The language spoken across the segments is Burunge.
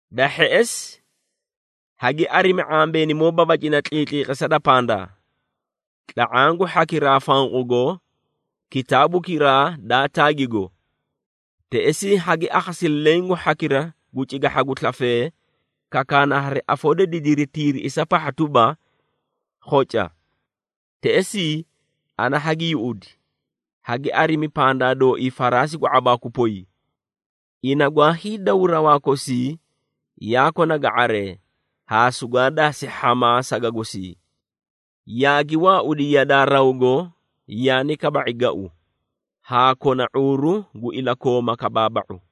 Da hheꞌesi, hagi arimi ⁄ambeenimoo babacina tliitliqisa da pandaa, tla⁄aã gu hhakiraa fanqugo kitaabukiraa daa taagigo. Teꞌesii hagi akhasi leẽ gu hhakiraa gu cigahha gu slafee, kakaana hari afoo da didiri tiiriꞌisa pahha tuba, “Khoca!” Teꞌesii, ana hagi yuꞌudi, hagi arimi pandaa dooii faraasi gu ⁄abaaku poy! Ina gwaa hiidaw rawaa kosii yaa kona ga⁄aree, haa sugwaa daasi hhamaa saga gosii. Yaagi waaudi yadaa rawgo yaani kaba⁄i gau, haa kona ⁄uuru gu ilakooma kabaaba⁄u.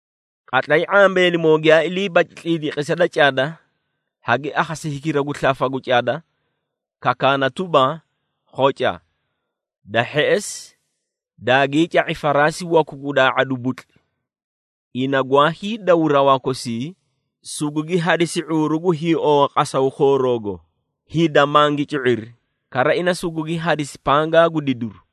Qatlay ⁄ambeenimoo giyaa ilii baci tliitliqisa da cada, hagi akhasi hikira gu slafa gu cada, kakaana tuba, “Khoca!” Da hheꞌesi, daagii ca⁄i faraasi waku gu daa⁄adu butli. Ina gwaa hiidaw rawaa kosii, sugugi hadisi ⁄uuru gu hiiowa qasaw khooroogo, hida mangi cu⁄iri, kara ina sugugi hadisi pangaa gu didiru.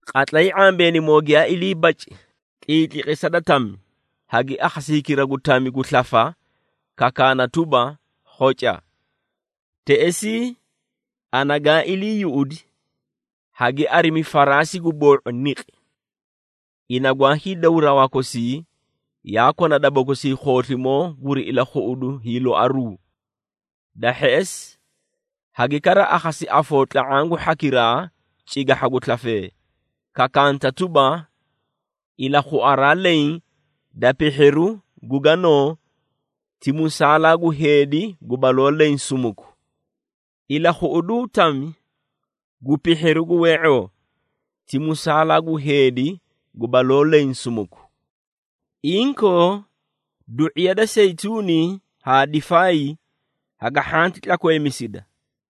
Qatlay ⁄ambeenimoo giyaa ilii baci tliitliqisa da tami, hagi akhasi hikira gu tami gu slafa, kakaana tuba, “Khoca!” Teꞌesii, ana gaa ilii yuꞌudi, hagi arimi faraasi gu boo⁄u niqi! Ina gwaa hiidaw rawaa kosii, yaa kona daba gosii khooslimoo guri ilakhuꞌudu hiiloaruu. Da hheꞌesi, hagi kara akhasi afoo tla⁄aã gu hhakiraa cigahha gu slafee, kakaanta tuba, “Ilakhuaraa leẽ da pihhiru gu ganoo, ti musaalaa gu heedi gu baloo leẽ sumuku. Ilakhuꞌuduu tami gu pihhiru gu wee⁄oo, ti musaalaa gu heedi gu baloo leẽ sumuku. Inkoo du⁄iya da seyituuni haa difaay haga hhanti tlakweemisida!”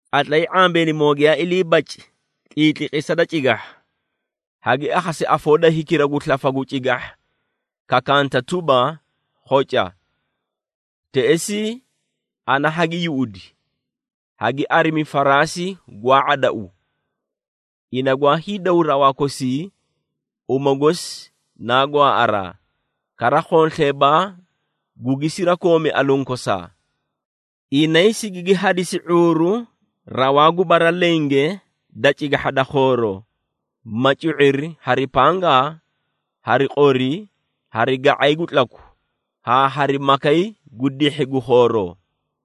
Qatlay ⁄ambeenimoo giyaa ilii baci tliitliqisa da cigahha, hagi akhasi afoo da hikira gu slafa gu cigahha kakanta tuba, “Khoca.” Teꞌesii, ana hagi yuꞌudi, hagi arimi faraasi gwaa ⁄adau! Ina gwaa hiidaw rawaa kosii, uma gosi naa gwaaꞌaraa, kara khonsleebaa gugi sirakoomi aluũ kosaa. Inay sigigi hadisi ⁄uuru rawaa gu bara lenge da cigahha da khooroo, ma cu⁄iri hari pangaa, hari qori, hari ga⁄ay gu tlaku, haa hari makay gu dihhi gu khooroo.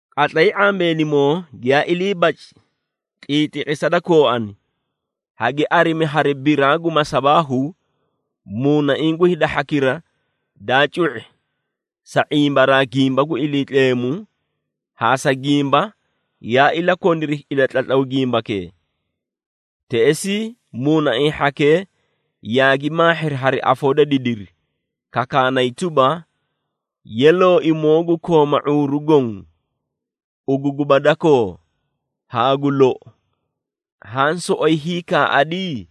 Qatlay ⁄ambeenimoo giyaa ilii baci tliitliqisa da kooani, hagi arimi hari biraa gu masabaahu, muunaiĩ gu hida hhakira daa cu⁄i sa ⁄imbaraa gimba gu Iliitleemu haa sa gimba yaa ilakoniri ilatlatlaw gimbakee. Teꞌesii, muunaiĩ hhakee yaagi maahhiri hari afoo da didiri, kakaanay tuba, “Yee Looimoo gu kooma ⁄uuru goõ, ugu guba dakoo, haa gu lou, haã soꞌoyi hiikaaꞌadi?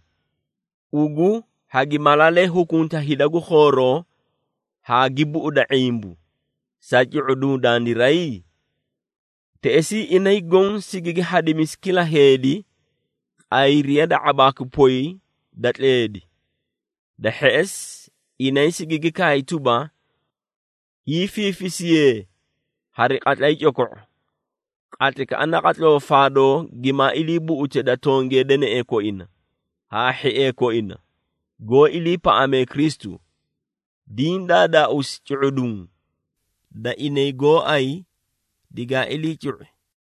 Ugu hagi malaalee hukunta hida gu khooroo haa gi buꞌuda ⁄imbu, sa cu⁄uduũ dandiray?” Teꞌesii, inay goõ sigigi hadimisi kila heedi qayriya da ⁄abaakwi poy da tleedi. Da hheꞌesi, inay sigigi kaay tuba, hiifiifisiyee hari qatlay coko⁄o, qatlaykaꞌa naqatloo faadoo gimaa ilii buꞌute da tongee deneꞌee koina, haa hhiee koina, goó iliipaꞌamee Kristu, diĩ daadaauusi cu⁄uduũ, da inay gooay digaa ilii cu⁄i.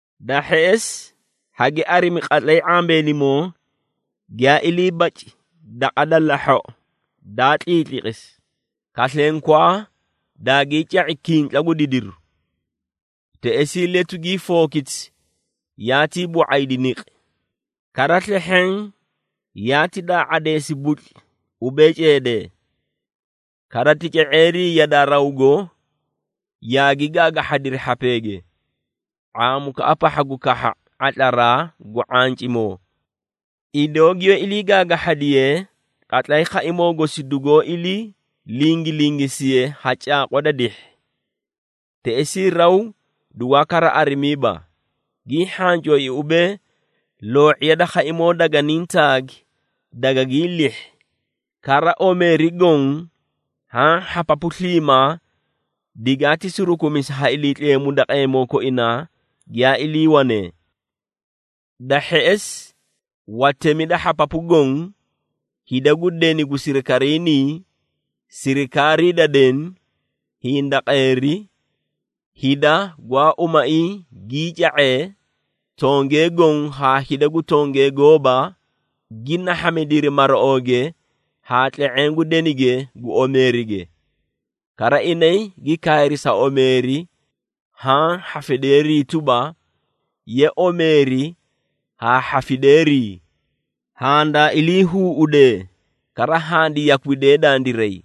Da hheꞌesi, hagi arimi qatlay ⁄ambeenimoo giyaa ilii baci daqa da lahhoꞌo daa tliitliqisi, kaslenkwaa daagii ca⁄i kintla gu didiru. Teꞌesii letu gii fookiti yaatii boo⁄aydi niqi, kara slehheẽ yaati daa⁄adeesi butli ubee ceedee. Kara tica⁄eerii yadaa rawgo, yaagi gaagahhadiri hhapeege, ⁄aamukaꞌa pahha gu kahha ⁄atlaraa gu ⁄ancimoo, idoo giyoó ilii gaagahhadiye qatlay khaimoo gosi dugoo ilii lingilingisiye ha caaqwa da dihhi. Teꞌesii raw dugwaa kara arimiiba, gii hhancooi ubee, loo⁄iya da khaimoo daganiĩ taagi dagagii lihhi, kara omeeri goõ haã hhapapu sliimaa digaati surukumisi ha Iliitleemu daqeemoo koinaa giyaa iliiwanee. Da hheꞌesi, watemi da hhapapu goõ, hida gu deni gu sirikariinii, sirikaarii da deni, hindaqeeri, hida gwaa umaiĩ gii ca⁄ee, tongee goõ haa hida gu tongee gooba, gi nahhamidiri maraooge haa tle⁄eẽ gu denige gu omeerige. Kara inay gi kaayri sa omeeri haã hhafideerii tuba, “Ye omeeri haa hhafideerii! Handaa iliihuuꞌudee, kara handi yakwidee dandiray,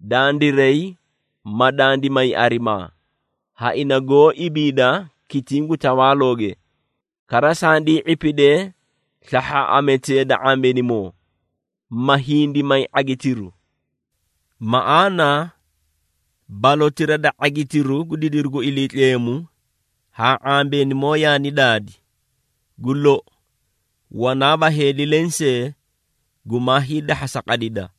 dandiray ma dandi may arimaa, ha ina goó ibiida kitiĩ gu tawaalooge, kara sandii ⁄ipidee slahhaaꞌametee da ⁄ambeenimoo, ma hindi may ⁄agitiru! Maꞌaana balotira da ⁄agitiru gu didiru gu Iliitleemu haa ⁄ambeenimoo yaani daadi, gu lou, wanaaba heedi lensee gumaa hiidahhasa qadida.”